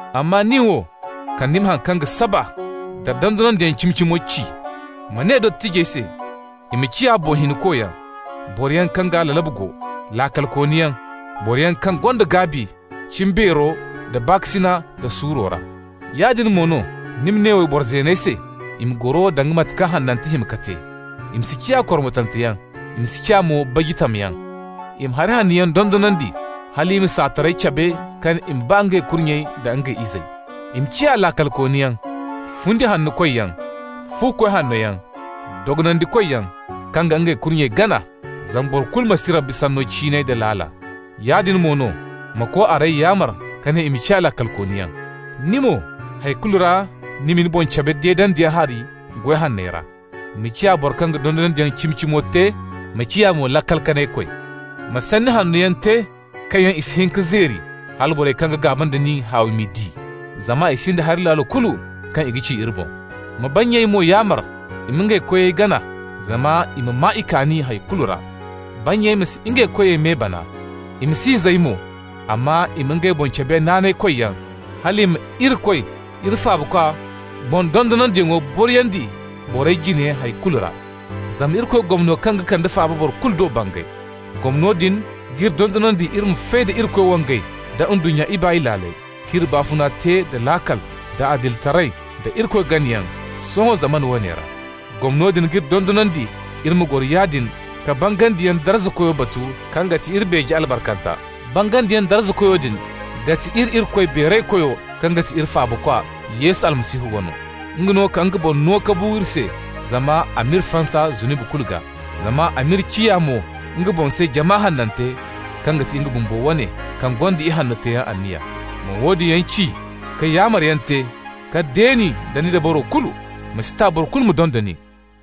Amma ni wo, kala ni ma haŋ kaŋ ga saba nda dondonandiyaŋ cimi-cimo ci. Ma ne dottijey se i ma ciya boŋ hinkoyaŋ, boroyaŋ kaŋ gaa lalabu go, laakalkooniyaŋ, boroyaŋ kaŋ gonda gaabi cimbeero da baakasina da suuro ra. Yaadin mo no ni ma ne wayboro zeeney se i ma goro danga mate kaŋ hanantey hima ka te. I ma si ciya kormotanteyaŋ, i ma si ciya mo baji tamyaŋ. I ma hari hanno yaŋ dondonandi, hal i ma saatarey cabe ka ne i ma ba ngey kurnyey da ngey izey. I ma ciya laakalkooniyaŋ, fundi-hanno-koyyaŋ, fu-koy hannoyaŋ, dogonandikoyaŋ, kaŋ ga ngey kurnyey gana, zama boro kulu ma si Irikoy Sanno ciinay da laala. Yaadin mo no, ma ko-arey yaamar ka ne i ma ciya laakalkooniyaŋ. Ni mo, hay kulu ra ma ni boŋ cabe deedandiyaŋ hari goy hanney ra. Ma ciya boro kaŋ ga dondonandiyaŋ cimi-cimo te, ma ciya mo laakal-kanay-koy. Ma sanni hanno yaŋ te kaŋ yaŋ i si hin ka zeeri, hala borey kaŋ ga gaaba nda nin, haawi m'i di, zama i sinda hari laalo kulu kaŋ i ga ci iri boŋ. Ma bannyey mo yaamar i ma ngey koyey gana zama i ma maa i kaani hay kulu ra. Bannyey ma si ngey koyey me bana. I ma si n'i zay mo, amma i ma ngey boŋ cabe naanaykoyyaŋ, hal i ma Irikoy iri Faabakwa boŋ dondonandiyaŋo boriyandi borey jine hay kulu ra. Zama Irikoy gomno kaŋ ga kande faaba boro kulu do bangay. Gomno din g'iri dondonandi iri ma fay da Irikoy wangay da ndunnya ibaay laaley, k'iri baafuna te da laakal, da adilitaray, da Irikoy ganayaŋ sohõ zamana woone ra. Gomno din g'iri dondonandi iri ma goro yaadin ka bangandiyaŋ darzakoyo batu kaŋ ga ti iri beeje albarkanta. Bangandiyaŋ darzakoyo din ga ti iri Irikoy Beeraykoyo kaŋ ga ti iri Faabakwa, Yesu Almasihu, wano. Nga no ka nga boŋ no ka bu iri se zama a m'iri fansa zunubi kulu gaa. Zama a m'iri ciya mo nga boŋ se jama hanante kaŋ ga ti nga bumbo wane, kaŋ gonda ihanno teeyaŋ anniya. Ma woodin yaŋ ci, ka yaamaryaŋ te, ka deeni da ni dabaro kulu. Ma si ta boro kulu ma donda nin.